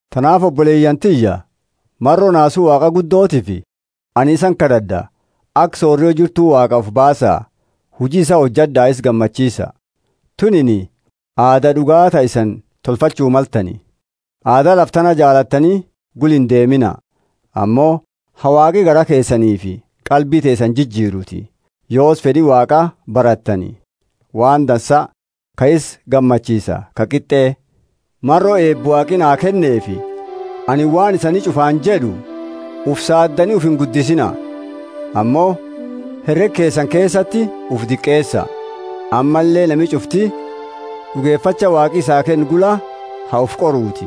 Tanaafi oboleyaani tiyya maro naasu Waaqa guddotiifi anini isani kad'ad'a; aka sorio jirtu Waaqaa ufi baasa huji isaa hojad'a isa gammachiisa. Tunini aada d'ugaa ta isani tolfachuu maltani. Aada lafa tana jaalattani gula indeemina, ammo ha Waaqi garaa keesaniifi qalbi teesani jijiruuti. Yoosi fed'i Waaqa barattani, waan dansa, ka isa gammachiisa, ka qit'e. Maro eeba Waaqi naa kenneefi anini waan isani ch'ufaani jed'u: Ufi saaddani ufi inguddisiina. Ammo herega keesani keesati ufi diqeesa, ammalle nami ch'ufti d'ugefacha Waaqi isaa kenne gula ha ufi qoruuti.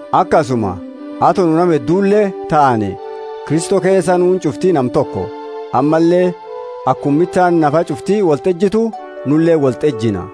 Akasuma ato nu nama heddule taane, Kristo keesa nuuni ch'ufti nama toko, ammalle akuma mitaani nafa ch'ufti wolti ejitu, nuleeni wolti ejina.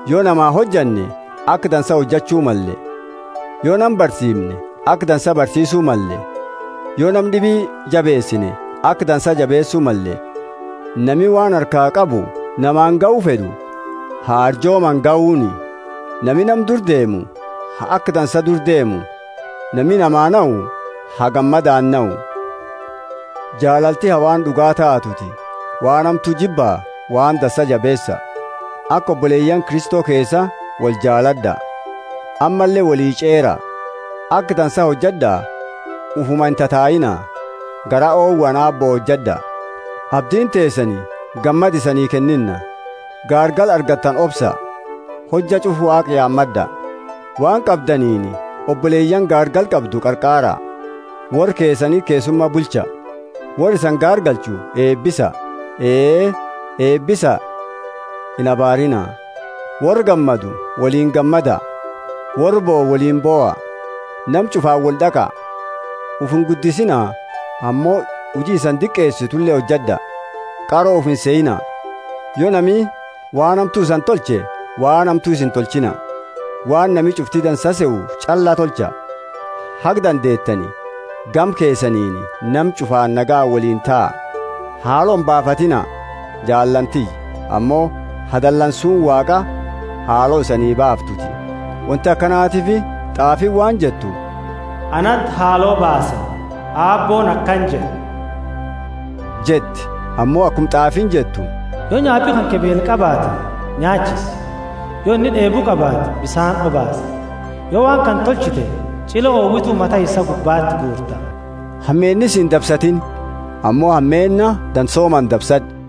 Yo namaa hojanne, aka dansa hojachu malle. Yo nama barsiimne, aka dansa barsiisu malle. Yo nama d'ibi jabeesine, aka dansa jabeesu malle. Nami waan harkaa qabu namaani gahu fed'u ha arjoomaani gahuuni; nami nama dura deemu ha aka dansa dura deemu; nami namaa nahu ha gammadaani nahu. Jaalalti ha waan d'ugaa taatuuti. Waan hamtu jibba, waan dansa jabeesa. Aka oboleyaani Kristo keesa woli jaalad'a, ammalle woli ch'eera. Aka dansa hojad'a, ufuma intataiina. Garaa owaani Aabbo hojad'a. Abdiini teesani gammada isanii kennina, gaargala argattani obsaa, hojja ch'ufa Waaqa yaamad'a. Waan qabdaniini oboleyaani gaargala qabdu qarqaara. Worra keesaniti keessuma bulcha. Worra isani gaargalchu eebisa; ee, eebisa, inabaariina. Worra gammadu woliini gammada, worra bohu woliini boha. Nama ch'ufaani wold'aqa. Ufi inguddisiina, ammo huji isani diqeesitule hojad'a. Qaro ufi insehiina. Yo nami waan hamtu isani tolche waan hamtu isa intolchiina. Waan nami ch'ufti dansa sehu ch'alla tolcha. Haga dandeetani gama keesaniini, nama ch'ufa nagayaani woliini taa. Haalo imbaafatiina, jaalaani tiyya, ammo ha dalansuuni Waaqaa haalo isani baaftuuti. Wonti akanatiifi t'aafiini waan jettu, Anati haalo baasa, Aabbooni akana jed'e jetti. Ammo akuma t'aafiini jettu: Yo nyaapi kanke beela qabaate, nyaachisi; yo inni d'eebu qabaate, bisaani obaasi; yo waan kana tolchite, ch'ile owitu mata isaa gubbati guurta. Hameenni sii indabsatiini, ammo hameenna dansoomaani dabsad'u.